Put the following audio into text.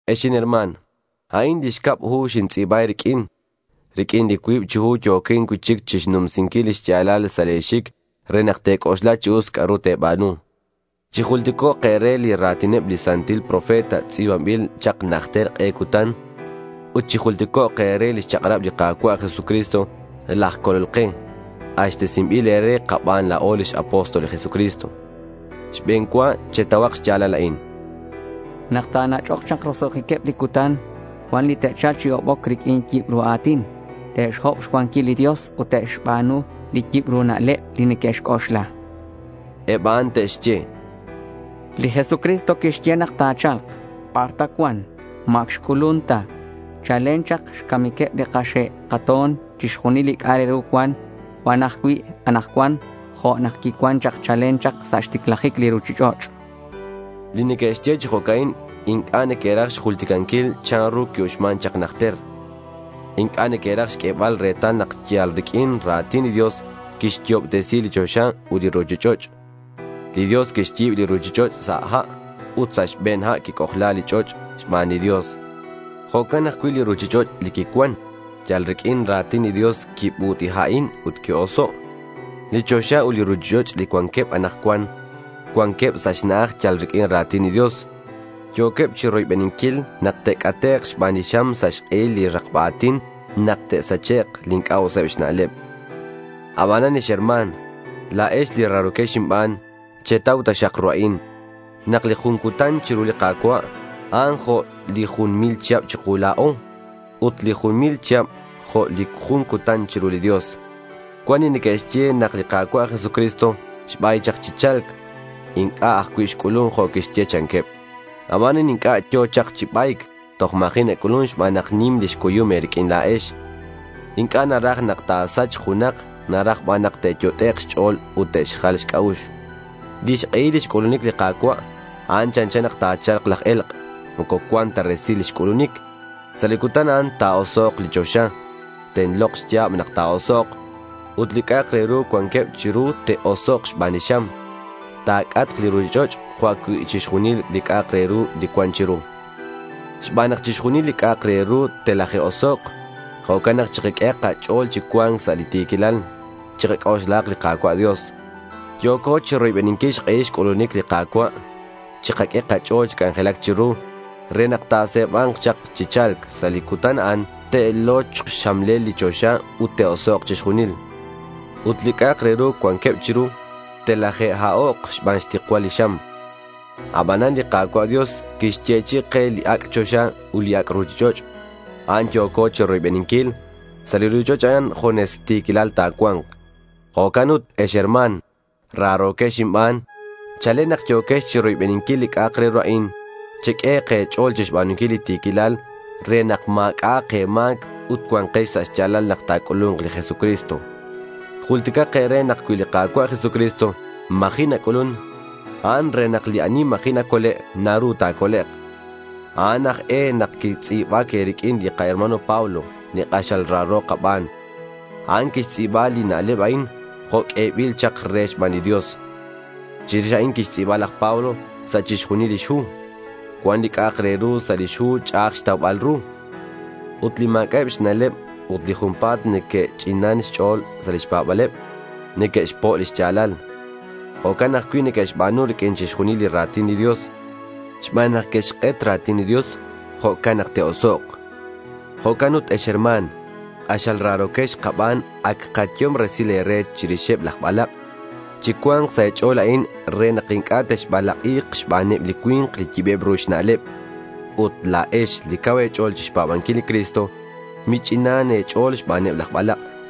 Ex inherma̱n, a'in li xcab hu nintz'i̱ba e̱riq'uin. Riq'uin li cuib chi hu yo̱quin cui'chic chixnumsinquil li xya̱lal sa' le̱ xic re nak te̱c'oxla chi us c'a'ru te̱ba̱nu. Chijulticok' e̱re li ra̱tineb li santil profeta tz'i̱banbil chak najter k'e cutan. Ut chijulticok' e̱re lix chak'rab li Ka̱cua' Jesucristo laj Colol ke, k'axtesinbil e̱re kaban la̱o lix apóstol li Jesucristo. Xbe̱n cua chetauhak xya̱lal a'in: Nak ta̱nach'ok chak roso'jiqueb li cutan, cuan li te'cha̱lk chi hoboc riq'uin yibru a̱tin. Te'xhob xcuanquil li Dios ut te'xba̱nu li yibru na'leb li neque'xc'oxla. Eb a'an te'xye: Li Jesucristo quixye nak ta̱cha̱lk. ¿Bar ta cuan? ¿Ma ac xc'ulun ta? Chalen chak xcamiqueb li kaxe' kato̱n chixjunil li c'a'ak re ru cuan ajcui' anakcuan jo' nak quicuan chak chalen chak sa' xticlajic li ruchich'och', cha'keb. Li neque'xye chi jo'can inc'a' neque'raj xjulticanquil chanru qui-uxman chak najter. Inc'a' neque'raj xq'uebal retal nak yal riq'uin ra̱tin li Dios quixyo'obtesi li choxa ut li ruchich'och'. Li Dios quixyi̱b li ruchich'och' sa' ha' ut sa' xbe̱n ha' quic'ojla li ch'och' xban li Dios. Jo'can ajcui' li ruchich'och' li quicuan. Yal riq'uin ra̱tin li Dios, quibut'ha'in ut qui-oso'. Li choxa ut li ruchich'och' li cuanqueb anakcuan, cuanqueb sa' xna'aj yal riq'uin ra̱tin li Dios. Yo̱queb chiroybeninquil nak te'c'atek' xban li xam sa' xk'ehil li rakba a̱tin nak te'sachek' li inc'a' useb xna'leb. Abanan ex herma̱n, la̱ex li raro̱quex inban, chetau taxak ru a'in: Nak li jun cutan chiru li Ka̱cua' a'an jo' li jun mil chihab chiku la̱o, ut li jun mil chihab jo' li jun cutan chiru li Dios. Cuan li neque'xye nak li Ka̱cua' Jesucristo xbay chak chi cha̱lc. Inc'a' ajcui' xc'ulun jo' quixye, chanqueb. Abanan inc'a' yo̱ chak chi ba̱yc. Toj ma̱ji' nac'ulun xban nak nim lix cuyum e̱riq'uin la̱ex. Inc'a' naraj nak ta̱sachk junak. Naraj ban nak te'yot'ek' xch'o̱l ut te'xjal xc'a'ux. Lix k'ehil lix c'ulunic li Ka̱cua', a'an chanchan nak nachal laj e̱lk'. Moco cuan ta resil lix c'ulunic. Sa' li cutan a'an ta̱osok' li choxa. Tenlok xya̱b nak ta̱osok'. Ut li c'a'ak re ru cuanqueb chiru te'osok' xban li xam. Ta̱c'atk li ruchich'och' jo' ajcui' chixjunil li c'a'ak re ru li cuan chiru. Xban nak chixjunil li c'a'ak re ru telaje'osok', jo'can nak chikaq'ue kach'o̱l chi cua̱nc sa' li ti̱quilal. Chikac'oxlahak li Ka̱cua' Dios. Yo̱co chiroybeninquil xk'ehil xc'ulunic li Ka̱cua'. Chikaq'ue kach'o̱l chi c'anjelac chiru re nak ta̱se̱ba̱nk chak chi cha̱lc. Sa' li cutan a'an te'lochk xxamlel li choxa ut te'osok' chixjunil. Ut li c'a'ak re ru cuanqueb chiru telaje'ha'ok' xban xtikcual li xam. Abanan li Ka̱cua' Dios quixyechi'i ke li ac' choxa ut li ac' ruchich'och'. A'an yo̱co chiroybeninquil. Sa' li ruchich'och' a'an junes ti̱quilal ta̱cua̱nk. Jo'can ut ex herma̱n, raro̱quex inban, chalen nak yo̱quex chiroybeninquil li c'a'ak re ru a'in, cheq'ue e̱ch'o̱l chixba̱nunquil li ti̱quilal re nak ma̱c'a'ak e̱ma̱c ut cua̱nkex sa' xya̱lal nak ta̱c'ulu̱nk li Jesucristo. Julticak e̱re nak cui li Ka̱cua' Jesucristo ma̱ji' nac'ulun, a'an re nak li ani ma̱ji' nacole' naru ta̱colek'. A'an aj e nak quitz'i̱bac e̱riq'uin li kaherma̱n Pablo, li k'axal raro kaban. A'an quixtz'i̱ba li na'leb a'in jo' q'uebil chak re xban li Dios. Chirix a'in quixtz'i̱ba laj Pablo sa' chixjunil lix hu. Cuan li c'a'ak re ru sa' lix hu ch'a'aj xtaubal ru. Ut li ma̱c'a'eb xna'leb ut li junpa̱t neque'ch'inan xch'o̱l sa' lix pa̱ba̱leb neque'xpo' li xya̱lal. Jo'can ajcui' neque'xba̱nu riq'uin chixjunil li ra̱tin li Dios. Xban nak neque'xk'et ra̱tin li Dios, jo'can nak te'osok'. Jo'can ut ex herma̱n, k'axal raro̱quex kaban, ac kayehom resil e̱re chirixeb laj balak'. Chicua̱nk sa' e̱ch'o̱l a'in re nak inc'a' texbalak'i̱k xbaneb li cui̱nk li yibeb ru xna'leb. Ut, la̱ex li cau e̱ch'o̱l chixpa̱banquil li Cristo, mich'inan e̱ch'o̱l xbaneb laj balak'.